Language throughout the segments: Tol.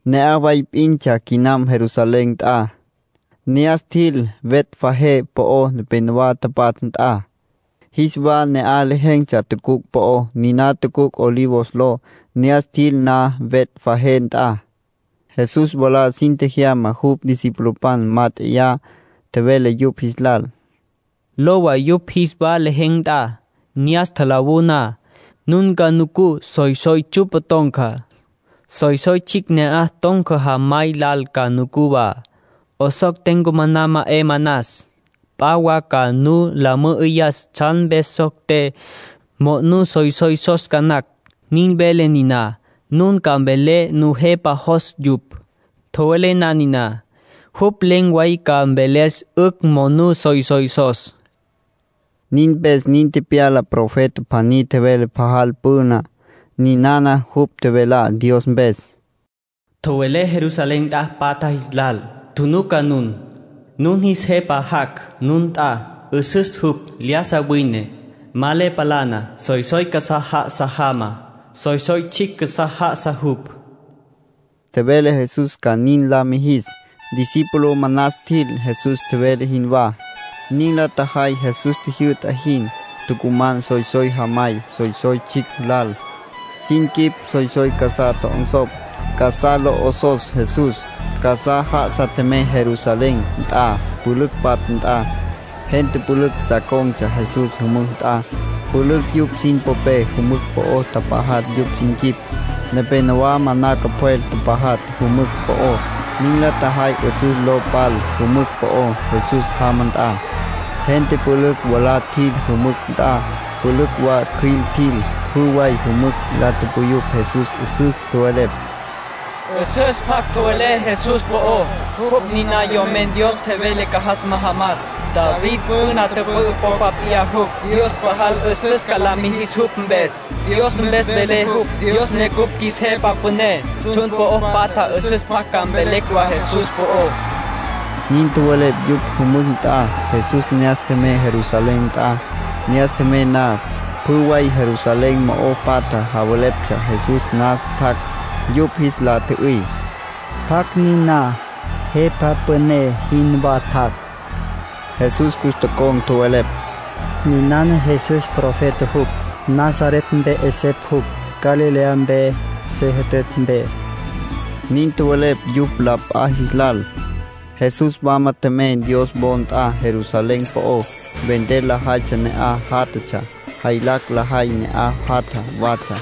Ne'aj way p'intsja quinam Jerusalén nt'a. Ne'as tjil Betfagé po'ó nepénowa tapatja nt'a. Jis wa ne'aj lejen̈tsja tucuc' po'ó, niná tucuc' Olivos ló. Ne'as tjil na Betfagé nt'a, Jesús mwalá sin tjejyama jupj discipulopan mát'eya. Tjevele yupj jis lal: “Lowa yupj jis wa lejen̈ nt'a. Ne'as tjalawú na, nun ca nucú soysoy tsyu'pa ton̈ca. Soysoy tsjicj ne'aj ton̈ca jamay lal ca nucú wa. 'Osocté, ncumaná ma 'e manas. P'a wa ca nu la mü'üyas tsjan mpes socté, monú soysoysos ca nacj. Nin vele niná, nun ca mvelé Nujepa jos yupj. Tjowelé na niná, jupj len̈ way ca mveles 'ücj monú soysoysos”, nin tjevele Jesús yupj jis lal. Nin mpes nin tepyala profeta pjaní tjevele pajal püna. Ninana jupj tjevelá Dios mpes: “Tjowelé Jerusalén nt'a patja jis lal: ‘Tjunuca nun. Nun jis jepa jac' nun nt'a. 'Üsüs jupj. Lyájasa wine. Ma le palana. Soysoy casá já'asa jama. Soysoy tsjicj casá já'asa jupj.’” Nin tjevele profeta. Tjevele Jesús ca nin la mijis. Discípulo manas tjil Jesús tjevele jinwá. Nin la tjajay Jesús tjijyü'ta jin. Tucuman soysoy jamay soysoy tsjicj lal. Sin quip soysoy casá tjo'onsopj, casá lo 'osos Jesús. Casá já'asa tjemey Jerusalén nt'a, pülücj patja nt'a. Gente pülücj sa con̈tsja Jesús jümücj nt'a. Pülücj yupj sin popé jümücj po'o tapajatj yupj sin quip. Nepénowa manaca pjwel tapajatj jümücj po'ó. Nin la tjajay 'üsüs lo pal jümücj po'ó, Jesús jama nt'a. Gente pülücj mwalá tjil jümücj nt'a. Pülücj wa cjüil tjil. Pjü way yümücj la tupuyupj Jesús 'üsüs. Tjowelepj: “'Üsüs pjac tjowelé Jesús po'ó. Jupj niná Yomen Dios tjevele ca jas majamas. David püna tüpü'ü popa p'iyá jupj. Dios pajal 'üsüs ca la mijis jupj mpes. Dios mpes vele jupj, Dios ne cupj qjuis Jepa Püné. Tsjun po'o patja 'üsüs pjac ca mvelecj wa Jesús po'ó.” Nin tjowelepj yupj jümücj nt'a. Jesús ne'as tjemey Jerusalén nt'a. Ne'as tjemey na, pjü way Jerusalén mo'o patja javeleptsja Jesús nasa tjac'. Yupj jis la tjü'üy: —¿Pjacj niná, jepa püné jinwá tjac'? Jesús cus tocon̈ tjowelepj: —Ninana Jesús. Profeta jupj. Nazaret mpe 'esepj jupj, Galilea mpe se jütütj mpe —nin tjowelepj yupj la p'a jis lal. Jesús wama tjemey Dios wo nt'a Jerusalén po'ó. Vender lajaytsja ne'aj játjatsja. Jaylacj lajay ne'aj jatja watsja.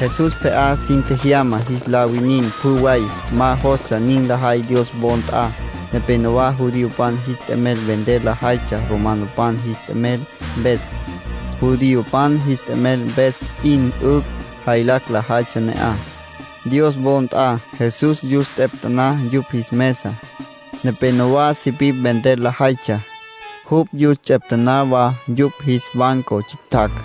Jesús pje'á sin tjejyama jis la winin pjü way. Ma jostsja nin lajay Dios wo nt'a. Nepénowa judiopan jis t'emel vender lajaytsja romanopan jis t'emel mpes. Judiopan jis t'emel mpes p'in 'ücj jaylacj lajaytsja ne'aj, Dios wo nt'a. Jesús yus ts'eptaná yupj jis mesa. Nepénowa sipipj vender lajaytsja. Jupj yus ts'eptaná wa yupj jis banco tsjictjacj.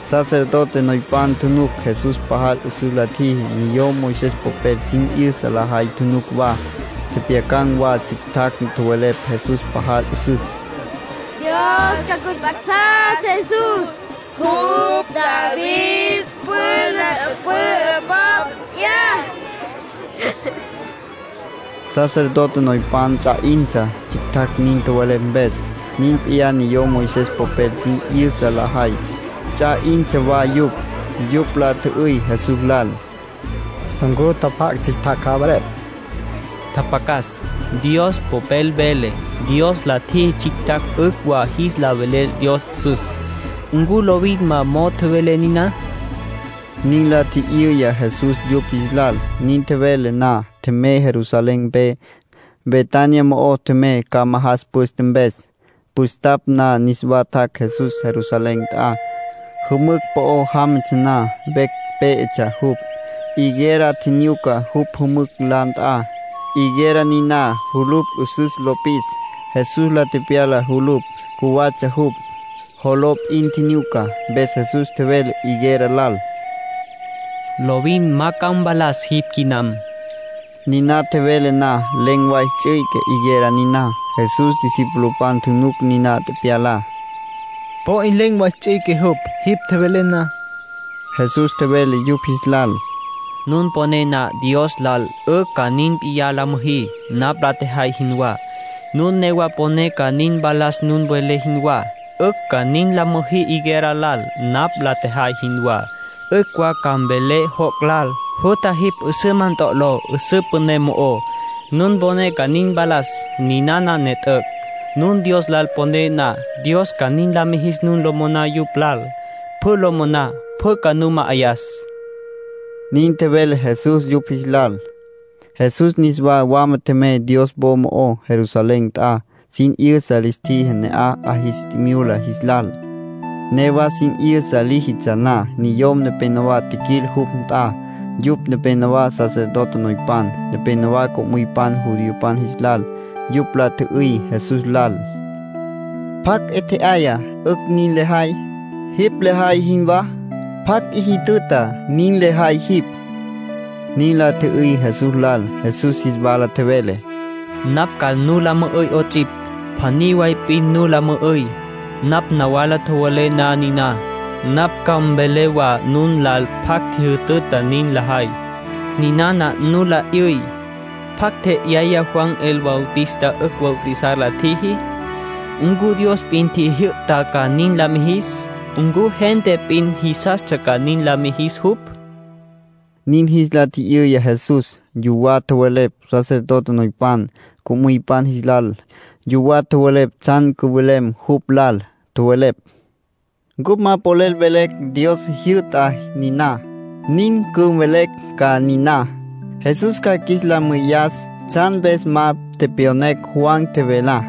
Sacerdote noypan tjunuc Jesús pajal 'üsüs la tjiji. Niyom Moisés popel sin 'yüsa lajay tjunuc wa. Tjepjyacan̈ wa tsjictjacj tjowelepj Jesús pajal 'üsüs. “Dios ca cus mp'a'sas Jesús —nin la tupuyupj tsjictjacj—. Jupj David püna tüpü'ü popa p'iyá”, tjowelepj yupj. Sacerdote noypan ts'a 'intsja tsjictjacj nin tjowelepj mpes. Nin p'iyá niyom Moisés popel sin 'yüsa lajay. Ts'a 'intsja wa yupj. Yupj la tjü'üy Jesús lal: —¿Ncu tjapjac' tsjictjacj javelepj? —Tjapjacas —tjevele Jesús—. Dios Popel vele: ‘Dios la tjiji tsjictjacj 'ücj wa jis la veles Dios 'üsüs’. ¿Ncu lovin ma mo'o tjowelé niná? —nin la tji'yüya Jesús yupj jis lal. Nin tjevele na, tjemey Jerusalén mpe. Betania mo'o tjemey ca majas püste mpes. Püstapj na niswa tjac' Jesús Jerusalén nt'a. Jümücj po'o jámatsja na, vecj pé'etsja jupj. Higuera tjinyuca jupj jümücj la nt'a. Higuera niná julupj 'üsüs lo pis. Jesús la tepyala julupj. Cjuwatsja jupj. Joló p'in tjinyuca. Mpes Jesús tjevele higuera lal: —Lovin ma ca mvalas jipj quinam. Niná tjevele na, len̈ way ts'üique higuera niná. Jesús discipulopan tjunuc niná tepyalá. —Po 'in len̈ way ts'üique jupj, jipj tjevelen na —tjowelepj yupj. Jesús tjevele yupj jis lal: —Nun poné na Dios lal, 'ücj ca nin p'iyá la müjí, napj la tjejay jinwá. Nun newa poné ca nin mpalas nun welé jinwá, 'ücj wa ca nin la müjí higuera lal, napj la tjejay jinwá. 'Ücj wa ca mvelé joc' lal: ‘Jutja jipj 'üsüma ntolo 'üsǘ püné mo'ó’. Nun poné ca nin mpalas, ca nin mpalas. Ninana ne t'üc'. Nun Dios lal poné na, Dios ca nin la mijis nun lo moná jupj lal. Pjü lo moná, pjü ca nu ma'ayas —nin tjevele Jesús yupj jis lal. Jesús niswa wama tjemey Dios wo mo'ó Jerusalén nt'a. Sin 'yüsa lis tjiji ne'aj 'a jis tjimyula jis lal. Newa sin 'yüsa líjitsja na, niyom nepénowa tjiquil jupj nt'a. Yupj nepénowa sacerdote noypan, nepénowa co'müypan judiopan jis lal. Yupj la tjü'üy Jesús lal: —¿Pjacj 'e tje'aya 'ücj nin lejay, jipj lejay jinwá? ¿Pjacj 'i tjüjütüta nin lejay jipj? —nin la tjü'üy Jesús lal. Jesús jis wala tjevele: —Napj ca nu la mü'üy 'ots'ipj. Pjaní way p'in nu la mü'üy. Nun nawala tjowelé na niná, napj ca mvelé wa nun lal pjacj ntjijütüta nin lejay. Ninana nu la 'yüy: ¿Pjacj tje'yaya Juan el Bautista 'ücj bautizar la tjiji? ¿Ncu Dios p'in tjijyü'ta ca nin la mijis? ¿Ncu gente p'in jisastsja ca nin la mijis jupj? —nin jis la tji'yüya Jesús. Yuwá tjowelepj sacerdote noypan, co'müypan jis lal. Yuwá tjowelepj tsjan cüwelem jupj lal. Tjowelepj: “Cupj ma polel velecj Dios tjijyü'ta niná. Nin cüvelecj ca niná, Jesús ca qjuis la mü'üyas tsjan mpes ma tepyonecj Juan tjevelá.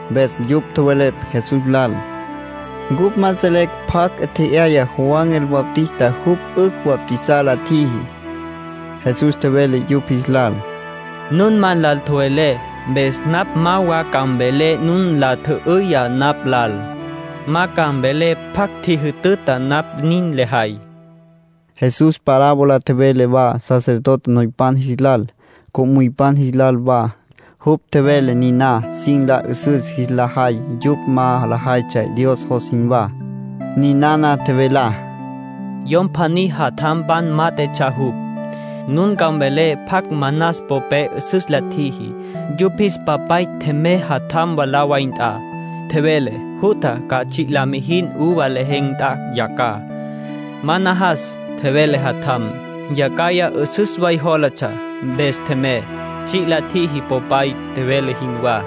Mpes yupj tjowelepj Jesús lal: —Cupj ma selecj pjacj tje'yaya Juan el Bautista jupj 'ücj bautizar la tjiji. Jesús tjevele yupj jis lal: —Nun ma nlal tjowelé, mpes napj ma wa ca mvelé nun nla tjü'üyá napj lal. Ma ca mvelé pjacj ntjijütüta napj nin lejay —nin tjevele jupj. Jesús parábola tjevele wa sacerdote noypan jis lal, co'müypan jis lal wa. Jupj tjevele niná sin la 'üsüs jis la jay yupj ma lajaytsja Dios jos jinwá. Ninana tjevelá: —Yom pjaní jatjampan mát'etsja jupj. Nun ca mvelé pjacj manas popé 'üsüs la tjiji. Yupj jis papay tjemey jatjam mwalá way nt'a. Tjevele: ‘Jutja, ca tsji' la mijin uva lejen̈ nt'a yacjaj’. ‘Ma najas’, tjevele jatjam. Yacjaya 'üsüs way jólatsja, mpes tjemey. Tsji' la tjiji popay tjevele jinwá.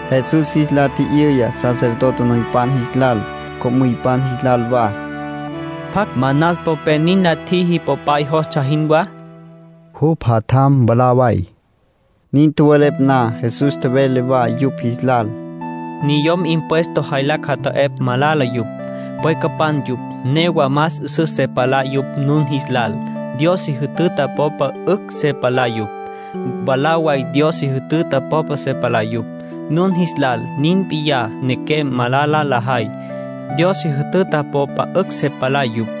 Jesús jis la tji'yüya sacerdote noypan jis lal, co'müypan jis lal wa: —¿Pjacj manas popé nin la tjiji popay jostsja jinwá? —Jupj jatjam mwalá way —tjowelepj yupj. Nin tjowelepj na, Jesús tjevele wa yupj jis lal: —Niyom impuesto jaylacj jata'epj malala yupj. Pwecapan yupj. Newa más 'üsüs se palá yupj nun jis lal. Dios si jütüta popa 'ücj se palá yupj. Mwalá way Dios si jütüta popa se palá yupj, nun jis lal. Nin p'iyá nequem malala lajay. Dios si jütüta popa 'ücj se palá yupj.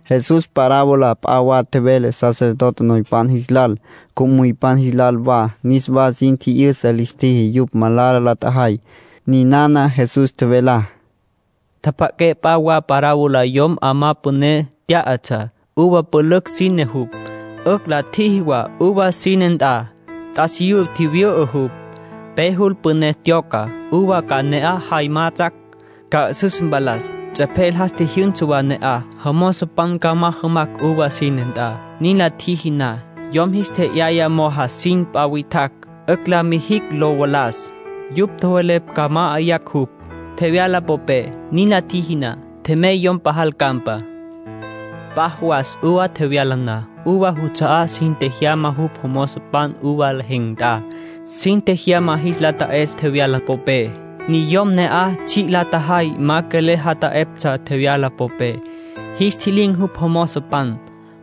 Jesús parábola p'a wa tjevele sacerdote noypan jis lal, co'müypan jis lal wa. Niswa sin tji'yüsa lis tjiji yupj malala la tjajay. Ninana Jesús tjevelá: —Tjapja'aqué p'a wa parabolas. Yom 'amá püné tyá'atsja. Uva pülücj sínetsja jupj. 'Ücj la tjiji wa uva sine nt'a. T'asiyú tjivyü'ü jupj. Pe jul püné tyoca, uva ca ne'aj jay majatsjacj, ca 'üsǘ mpalas. Ts'epjel jas tjijyünsa wa ne'aj, jomozopan ca majamacj uva sine nt'a. Nin la tjiji na, yom jis tje'yaya mo'o jasin p'a witjacj, 'ücj la mijicj lo valas. Yupj tjowelepj ca ma'ayacj jupj, tjevyala popé. Nin la tjiji na, tjemey yomen pajal campa. P'a jawas uva tjevyala na, uva juts'a'á sin tjejyama jupj jomozopan uva lejen̈ nt'a. Sin tjejyama jis la ta'es tjevyala popé. Niyom ne'aj tsji' la tjajay ma quelel ja'ayaptsja tjevyala popé. Jis ntji'lin̈ jupj jomozopan.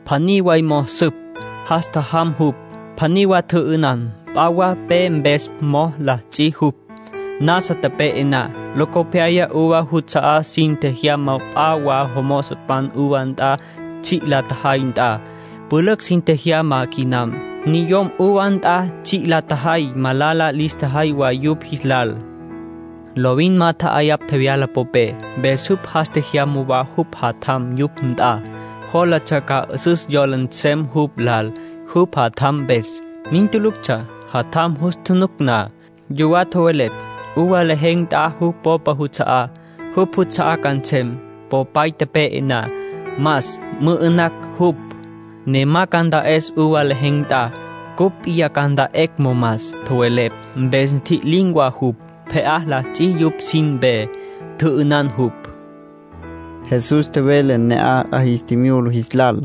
Pjaní way mo'o süp, jas tjajam jupj. Pjaní wa tjü'ünan. P'a wa pe mpes po'o la ts'i jupj, nasa tepe'e na. Locopyaya uva juts'a'á sin tjejyama p'a wa mozopan uva nt'a tsji' la tjajay nt'a. Pülücj sin tjejyama quinam. Niyom uva nt'a tsji' la tjajay malala lis tjajay wa yupj jis lal. ”Lovin ma tja'ayapj tjevyala popé, mpes jupj jas tjejyama wa jupj jatjam yupj nt'a. Jólatsja ca 'üsüs yola nsem jupj lal, jupj jatjam mpes. Nin tuluctsja. Jatjam jus tjunuc na, yuwá tjowelepj: ‘Uva lejen̈ nt'a jupj popay juts'a'á. Jupj juts'a'á ca nsem, popay tepe'e na. Mas, mü'ünacj jupj, ne ma ca nta'es uva lejen̈ nt'a. Cupj p'iyá ca nt'anquecj momas’, tjowelepj. Mpes ntji'lin̈ wa jupj. Pje'á la ts'i jupj sin mpe. Tjü'ünan jupj —nintsja parabolas. Jesús tjevele ne'aj 'a jis tjimyula jis lal: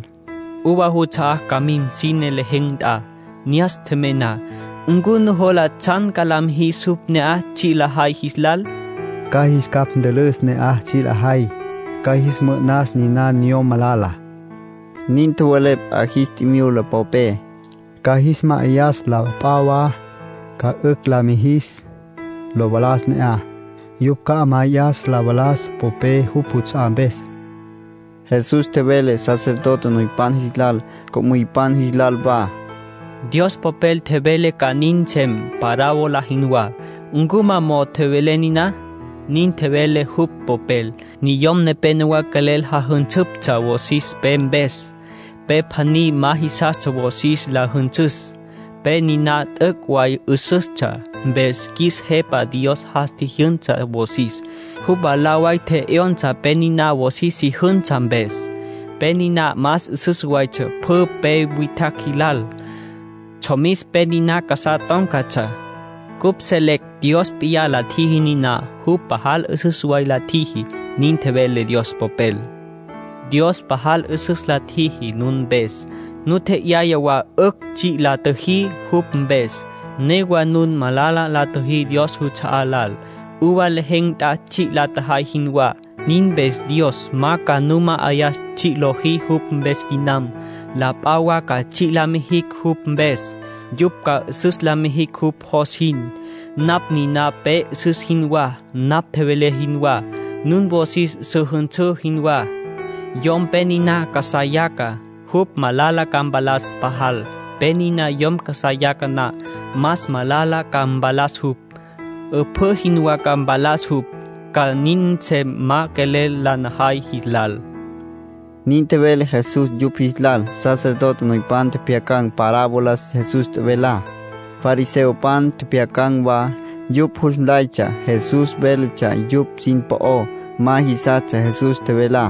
—Uva juts'a'á ca mim sine lejen̈ nt'a. Ne'as tjemey na ¿ncu nujola tsjan ca la mijis jupj ne'aj tsji' lajay jis lal? —Ca jis capj ntülüs ne'aj tsji' lajay. Ca jis mü'ü'nas niná niyom malala —nin tjowelepj 'a jis tjimyula popé—. Ca jis ma'ayas la p'a wa ca 'ücj la mijicj lo valas ne'aj. Yupj ca ma'ayacj tjevyala popé jupj juts'a'á mpes —nin tjowelepj yupj. Jesús tjevele sacerdote noypan jis lal, co'müypan jis lal wa: —Dios Popel tjevele ca nin nsem, parábola jinwá. ¿Ncu ma mo'o tjowelé niná? Nin tjevele jupj Popel: ‘Niyom nepénowa quelel jajünsüptsja wosis pe mpes. Pe pjaní ma jisastsja wosis la jünsüs. Pe niná t'üc' way 'üsüstsja. Mpes qjuis Jepa Dios jas tjijyünsa wosis. Jupj mwalá way tje'yonsa pe niná wosis si jünsa mpes. Pe niná más 'üsüs waytsja pjü pe witjacj jilal. Tsjomis pe niná casá tón̈catsja. Cupj selecj Dios p'iyá la tjiji niná. Jupj pajal 'üsüs way la tjiji.’ Nin vele Dios Popel. ”Dios pajal 'üsüs la tjiji nun mpes. Nu tje'yaya wa 'ücj tsji' la tjüjí jupj mpes. Newa nun malala la tjüjí Dios juts'a'á lal, uva lejen̈ nt'a tsji' la tjajay jinwá. Nin mpes Dios ma ca nu ma'ayas tsji' lojí jupj mpes quinam. La p'a wa ca tsji' la mijicj jupj mpes. Yupj ca 'üsüs la mijicj jupj jos jin. Napj niná pe 'üsüs jinwá, napj tjevelé jinwá. Nun wosis su jünsǘ jinwá. Yom pe niná casá yaca, jupj malala ca mpalas pajal. Pe niná yom casá yaca na, más malala ca mpalas jupj. 'Üpjǘ jinwá ca mpalas jupj. Ca nin nsem ma quelel la najay jis lal —nin tjevele Jesús yupj jis lal. Sacerdote noypan tjepjyacan̈ parabolas Jesús tjevelá. Fariseopan tjepjyacan̈ wa. Yupj jus nlaytsja Jesús véletsja yupj sin po'ó. Ma jisastsja Jesús tjevelá.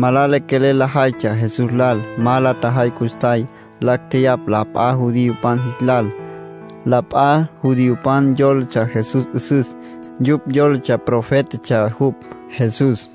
Malala quelel lajaytsja Jesús lal. Ma la tjajay custjay. Lacj tjeyapj la p'a judiopan jis lal. La p'a judiopan yólatsja Jesús 'üsüs. Yupj yólatsja profétatsja jupj, Jesús.